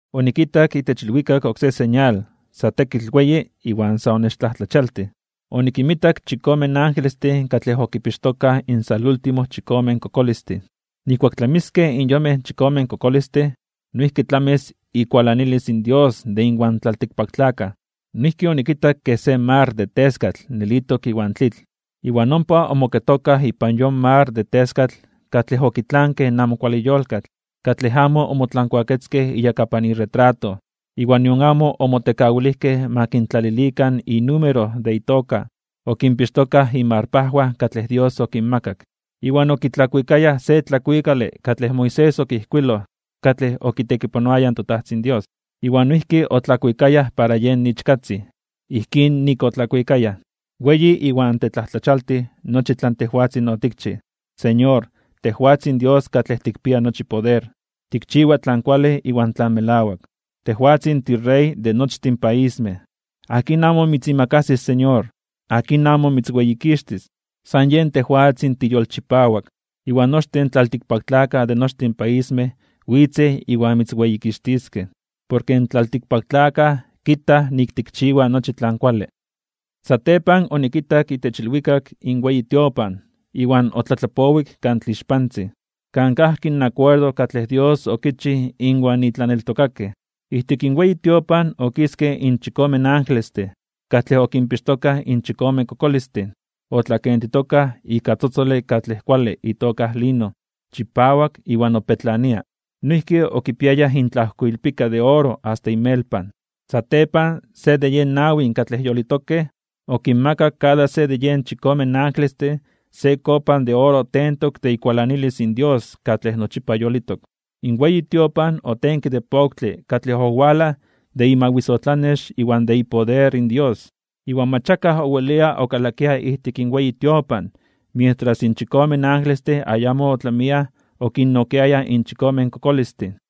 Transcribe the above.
Onikitak itech ilwikak oksé señal sa tekitl weyi iwan sa onechtlajtlachialtij (onechmajmawtij). Onikinmitak chikome angelestin katlej okipixtokaj in salúltimo chikome kokolistin. Nijkuak tlamiskej in yonmej chikome kokolistin, noijki tlamis ikualanilis in Dios de inwan tlaltikpaktlakaj. Noijki onikitak kej se mar de teskatl nelitok iwan tlitl. Iwan ompa omoketokaj ipan yon mar de teskatl katlej okitlankej in amo kuale yolkatl, katlej amo omotlankuaketzkej iyakapan iretrato, iwan nion amo omotekawilijkej ma kintlalilikan inúmero de itoka. Okinpixtokaj inmarpajwan katlej Dios okinmakak. Iwan okitlakuikayaj (okuikayaj) se tlakuikale katlej Moisés okijkuiloj katlej okitekipanoaya in toTajtzin Dios, iwan noijki otlakuikayaj para yen Ichkatzin. Ijkín nik otlakuikayaj: Weyi iwan tetlajtlachialtij (temajmawtij) nochi tlan tejwatzin otikchij, Señor, tejwatzin Dios katlej tikpia nochi poder. Tikchiwa tlan kuale iwan tlan melawak, tejwatzin tiRey de nochtin paismej. ¿Akin amo mitzimakasis, Señor? ¿Akin amo mitzweyikixtis? San yen tejwatzin tiyolchipawak, iwan nochtin tlaltikpaktlakaj de nochtin paismej witzej iwan mitzweyikixtiskej, porke in tlaltikpaktlakaj kitaj nik tikchiwa nochi tlan kuale. Satepan onikitak itech ilwikak in weyi tiopan iwan otlatlapowik Kan Tlixpantzin, kan kajki in akuerdo katlej Dios okichij inwan itlaneltokakej. Ijtik in weyi tiopan okiskej in chikome angelestin katlej okinpixtokaj in chikome kokolistin. Otlakentitokaj ika tzotzole katlej kuale itoka lino, chipawak iwan opetlania. Noijki okipiayaj intlajkoilpika de oro asta inmelpan. Satepan se de yen nawi katlej yolitokej, okinmakak kada se de yen chikome angelestin se kopa de oro tentok de ikualanilis in Dios katlej nochipa yolitok. In weyi tiopan otenke de poktle katlej owalaj de imawisotlanex iwan de ipoder in Dios. Iwan mach akaj owelia okalakia ijtik in weyi tiopan mientras in chikome angelestin ayamo otlamiaj okinnokiayaj in chikome kokolistin.